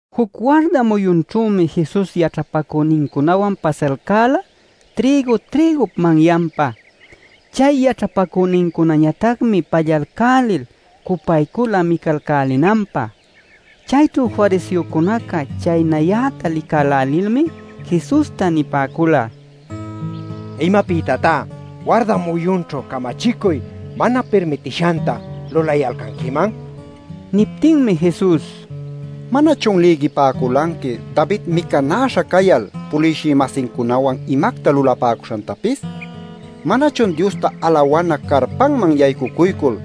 Juc warda muyunćhümi Jesus yaćhapacünincunawan pasayalcäla trïgu-trïgup manyanpa. Chay yaćhapacünincunañatacmi pallalcälil cupaycula micalcälinanpä. Chayćhu fariseocuna chaynayäta licälälilmi Jesusta nipäcula: “¡¿Imapïtatá warda muyunćhu camachicuy mana pirmitishanta lulayalcanquiman?!” nil. Niptinmi Jesus: “¿Manachun lïgipäculanqui David micanäśha cayal puliwshï-masincunawan imacta lulapäcuśhantapis? ¿Manachun Diosta alawana carpanman yaycucuycul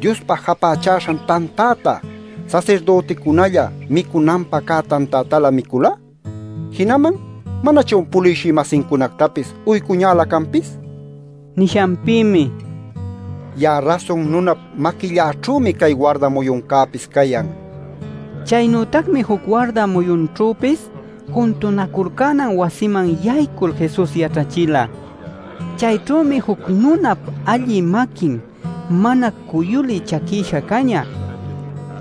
Diospä japächäśhan tantäta, sasirdüticunälla micunanpä cä tantätalä micüla? Jinaman ¿manachun puliwshï-masincunactapis uycuñälä canpis?” nila. Nishanpïmi: “Ya'a Rasun Nunap maquilläćhümi cay warda muyuncäpis cayan” nila. Chaynütacmi juc warda muyunćhüpis juntunaculcänan wasiman yaycul Jesus yaćhachila. Chayćhümi juc nunap allï maquin mana cuyulï chaquïsha cañä.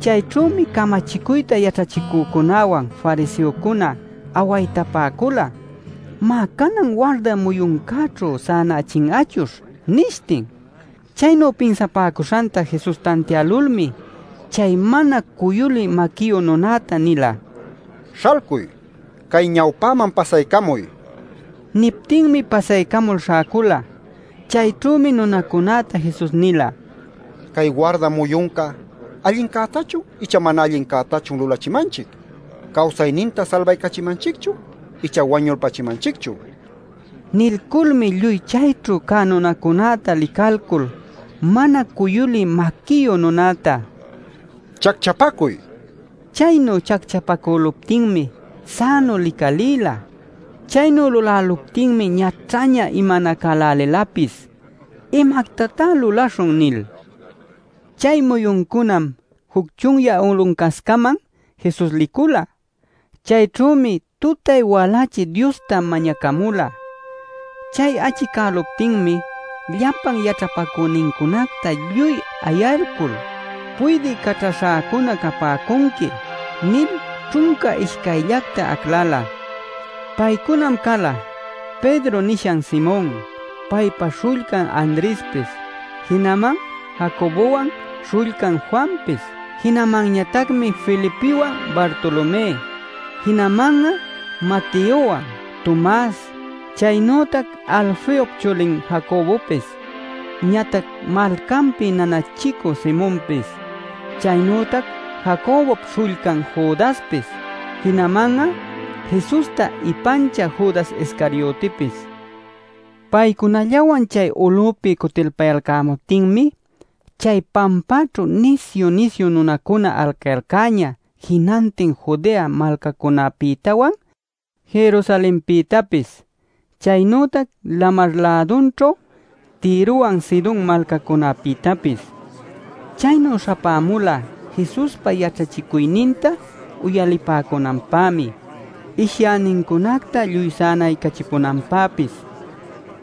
Chayćhümi camachicuyta yaćhachicücunawan fariseocuna awaytapäcula: “Má, canan warda muyuncäćhu sänachin'achuśh” nishtin. Chaynu pinsapäcuśhanta Jesus tantiälulmi chay mana cuyulï maquiyu nunäta nila: “¡Śhalcuy, cay ñawpäman pasaycamuy!” nil. Niptinmi pasaycamul śhäcula. Chayćhümi nunacunäta Jesus nila: “¿Cay warda muyunca allincätachun icha mana allincätachun lulachimanchic? ¿Cawsayninta salbaycachimanchicchun icha wañulpachimanchicchun?” nil. Nilculmi lluy chayćhu cä nunacunäta licalcul mana cuyulï maquiyu nunäta: “¡Chacchapacuy!” nila. Chaynu chacchapacüluptinmi sänu licalïla. Chaynu luläluptinmi ñaćhaña imanacälälilapis “¡¿Imactatá luläśhun?!” nil. Chay muyuncunam juc chunyä uluncascaman Jesus licula. Chayćhümi tutay-walächi Diosta mañacamula. Chay achicäluptinmi llapa yaćhapacünincunacta lluy ayalcul, “Puydï caćhaśhäcuna capäcunqui” nil ćhunca ishcayllacta aclala. Paycunam cala: “Pedro” nishan Simon, paypa śhullcan Andrespis. Jinaman Jacobowan śhullcan Juanpis. Jinamanñatacmi Felipiwan, Bartolomé. Jinaman'a Mateowan, Tomas. Chaynütac Alfeop chulin Jacobopis, ñatac malcanpi nanachicü Simonpis. Chaynütac Jacobop śhullcan Judaspis. Jinaman'a Jesusta ipanchä Judas Iscariotipis. Paycunallawan chay ulüpi cutilpayalcämuptinmi chay pampaćhu nisyu-nisyu nunacuna alcayalcäñä jinantin Judea malcacunapïtawan, Jerusalenpïtapis, chaynütac lamar-lädunćhu Tirowan Sidon malcacunapïtapis. Chaynu śhapämula Jesuspa yaćhachicuyninta uyalipäcunanpämi, ishyänincunacta lluy sänaycachipunanpäpis.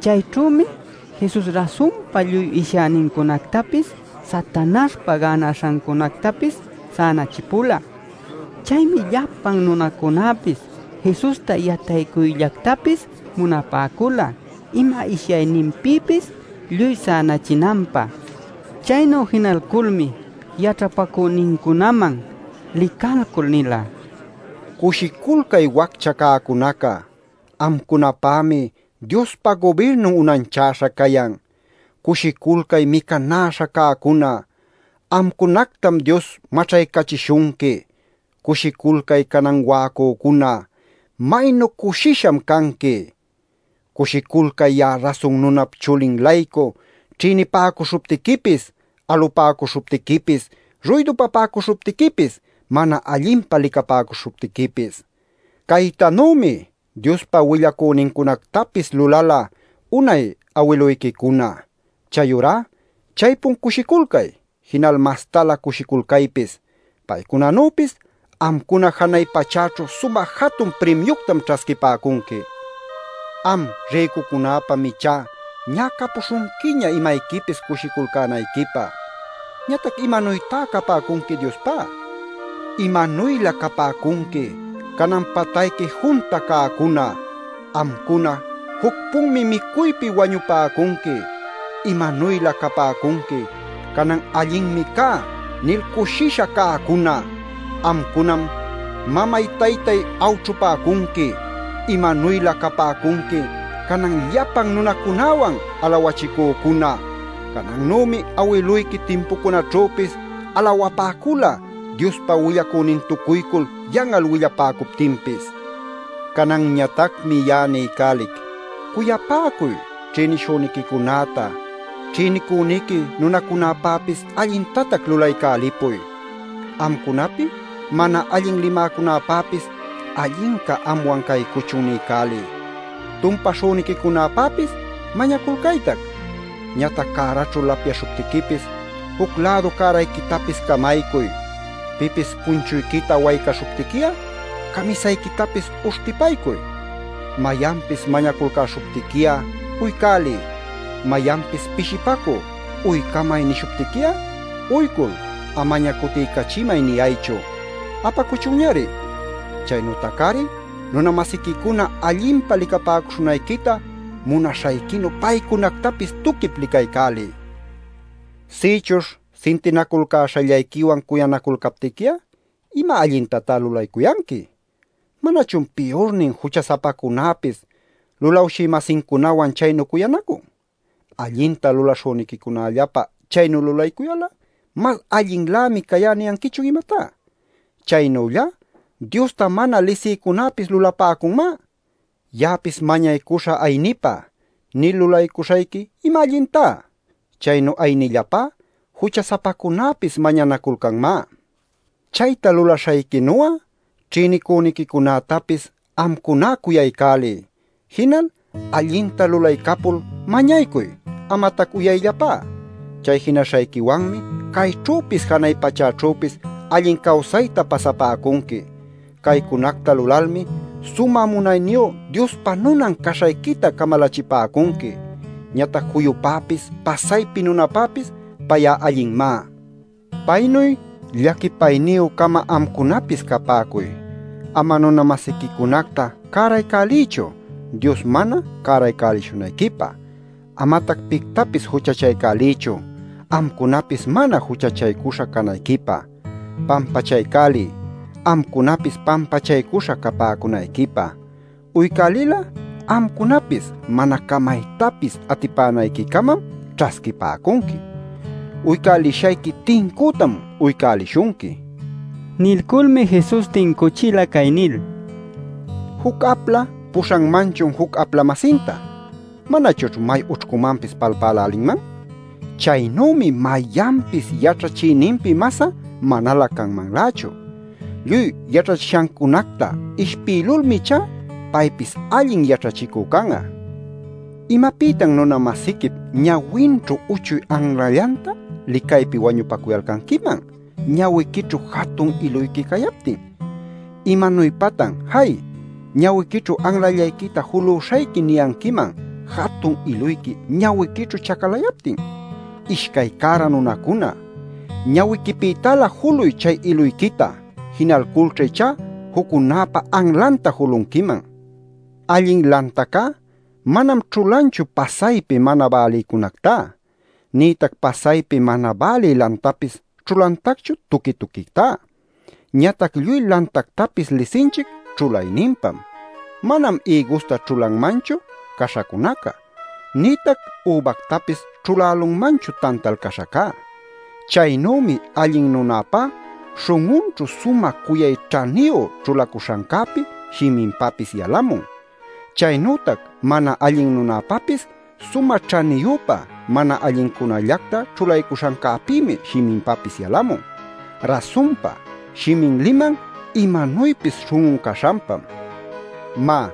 Chayćhümi Jesus rasunpa lluy ishyänincunactapis Satanaśhpa gänaśhacunactapis sänachipula. Chaymi llapan nunacunapis Jesusta yataycuyllactapis munapäcula ima ishyayninpïpis lluy sänachinanpä. Chaynu jinalculmi yaćhapacünincunaman licalcul nila: “Cushiculcay waccha cäcunaca. Amcunapämi Diospa gubirnun unanchäśha cayan. Cushiculcay micanäśha cäcuna. Amcunactam Dios maćhaycachishunqui. Cushiculcay canan wa'acücuna; ¡maynu cushicuśham canqui! Cushiculcay ya'a Rasun Nunap Chulin-laycu ćhïnipäcuśhuptiquipis, alupäcuśhuptiquipis, ruydupapäcuśhuptiquipis, mana allinpa licapäcuśhuptiquipis. Caytanümi Diospa willacünincunactapis lulala unay awiluyquicuna. Chayurá chaypun cushiculcay, jinal mastalä cushiculcaypis. Paycunanüpis amcuna janay pachäćhu sumä jatun primiuctam ćhasquipäcunqui. Am rïcucunäpam ichá ñä capuśhunquiña imayquipis cushiculcänayquipä. ¿Ñatac imanuytá capäcunqui Diospá? ¡Imanuylä capäcunqui canan patayqui junta cäcuna! Amcuna juc-punmi micuypi wañupäcunqui. ¡Imanuylä capäcunqui canan allinmi cä nil cushisha cäcuna! Amcunam mamay-taytayta awćhupäcunqui. ¡Imanuylä capäcunqui canan llapan nunacunäwan alawachicücuna! Canannümi awiluyqui timpucunaćhüpis alawapäcula Diospa willacünintucuycul yan'al willapäcuptinpis. “Cananñatacmi ya'a niycälic, cuyapäcuy ćhïnishüniquicunäta. Ćhïnicüniqui nunacunapäpis allintatac lulaycälipuy. Amcunapi mana allin limäcunäpäpis ‘Allinca anwan caycuchun’ niycäliy. Tumpäśhüniquicunapäpis mañaculcaytac. Ñatac cäraćhu lapyaśhuptiquipis, juc-lädu cärayquitapis camaycuy. Pipis punchuyquita waycaśhuptiqui'a, camisayquitapis uśhtipaycuy. Mayanpis mañaculcäśhuptiqui'a uycäliy. Mayanpis pishipacü ‘uycamay’ nishuptiqui'a uycul amaña ‘cutiycachimay’ niyaychu. Apacuchunñari. Chaynütac-ari nuna-masiquicuna allinpa licapäcuśhunayquita munaśhayquinu paycunactapis tuquip licaycäliy. Sïchuśh sintinaculcäśhallayquiwan cuyanaculcaptiqui'a ¿ima allintatan lulaycuyanqui? ¿Manachun piyurnin jucha-sapacunäpis lulawshï-masincunawan chaynu cuyanacun? Allinta lulaśhüniquicunallapä chaynu lulaycuyal'a ‘mas allinninlämi cayá’ ¿niyanquichun imatá? Chaynüllá Diosta mana lisïcunapis lulapäcunmá. ‘Ya'apis mañaycuśhä aynipä’ nil lulaycuśhayqui ¿ima allintá? Chaynu aynillapá jucha-sapacunäpis mañanaculcanmá. Chayta lulaśhayquinu'a ćhïnicüniquicunätapis amcuná cuyaycäliy. Jinal allinta lulaycapul mañaycuy, amatac uyayllapá. Chay jinaśhayquiwanmi cayćhüpis janay pachäćhüpis allin cawsayta pasapäcunqui. Caycunacta lulalmi Sumä Munayniyu Diospa nunan caśhayquita camalachipäcunqui. Ñatac juyupäpis pasaypi nunapäpis pay'a allinmá. Paynuy llaquipayniyü-cama amcunapis capäcuy. “Ama nuna-masiquicunacta cäraycäliychu Dios mana cäraycälishunayquipä. Amatac pictapis juchachaycäliychu, amcunapis mana juchachaycuśha canayquipä. Pampachaycäliy, amcunapis pampachaycuśha capäcunayquipä. Uycälil'a amcunapis mana camaytapis atipänayquicamam ćhasquipäcunqui. Uycälishayqui tincütam uycälishunqui” nil. Nilculmi Jesus tincuchila cay nil: “¿Juc apla puśhanmanchun juc apla-masinta? ¿Manachućh may ućhcumanpis palpälälinman? Chaynümi mayanpis yaćhachïninpi mas'a manalä canmanlächu. Lluy yaćhachishancunacta ishpïlulmi ichá paypis allin yaćhachicü can'a. ¿Imapïtan nuna-masiquip ñawinćhu uchuy anlallanta licaypi wañupacuyalcanquiman ñawiquićhu jatun iluyqui cayaptin? ¿Imanuypatan ‘Jay, ñawiquićhu anlallayquita julüśhayqui’ niyanquiman jatun iluyqui ñawiquićhu chacalayaptin? ¡Ishcay cära nunacuna! Ñawiquipïtalä juluy chay iluyquita. Jinalculćha ichá juccunäpa anlanta julunquiman. “Allin lantacá manam ćhulanchu pasaypi mana bälïcunactá, nïtac pasaypi mana bälï lantapis ćhulantacchu tuqui tuquictá. Ñatac lluy lantactapis lisinchic ćhulayninpam. Manam ïgusta ćhulanmanchu caśhacunaca. Nïtac übactapis ćhulälunmanchu tantal caśhacá. Chaynümi allin nunäpá śhun'unćhu sumä cuyay ćhaniyu ćhulacuśhancäpi shiminpapis yalamun. Chaynütac mana allin nunäpapis sumä ćhaniyüpa mana allincunallacta ćhulaycuśhancäpïmi shiminpapis yalamun. Rasunpa shimin liman imanuypis śhun'un caśhanpam. “Má,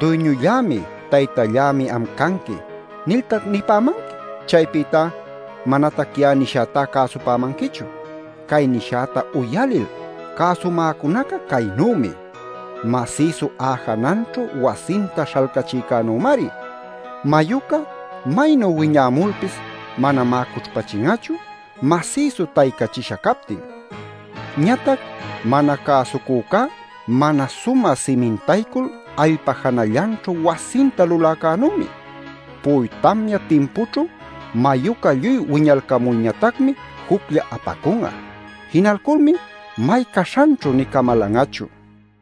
‘Duyñullämi, Taytallämi am canqui’ niltac nipämanqui, chaypïtá manatac ya'a nishätá cäsupämanquichu. Cay nishäta uyalil cäsumäcunaca caynümi: masïsu a'a jananćhu wasinta śhalcachïcänümari. Mayuca maynu wiñämulpis, manamá cućhpachin'achu, masïsu taycachisha captin. Ñatac mana cäsucücá mana sumä simintaycul allpa janallanćhu wasinta luläcänümi. Pu'uy tamya timpućhu mayuca lluy wiñalcamulñatacmi juclla apacun'a. Jinalculmi may caśhanćhu nï camalan'achu” nin.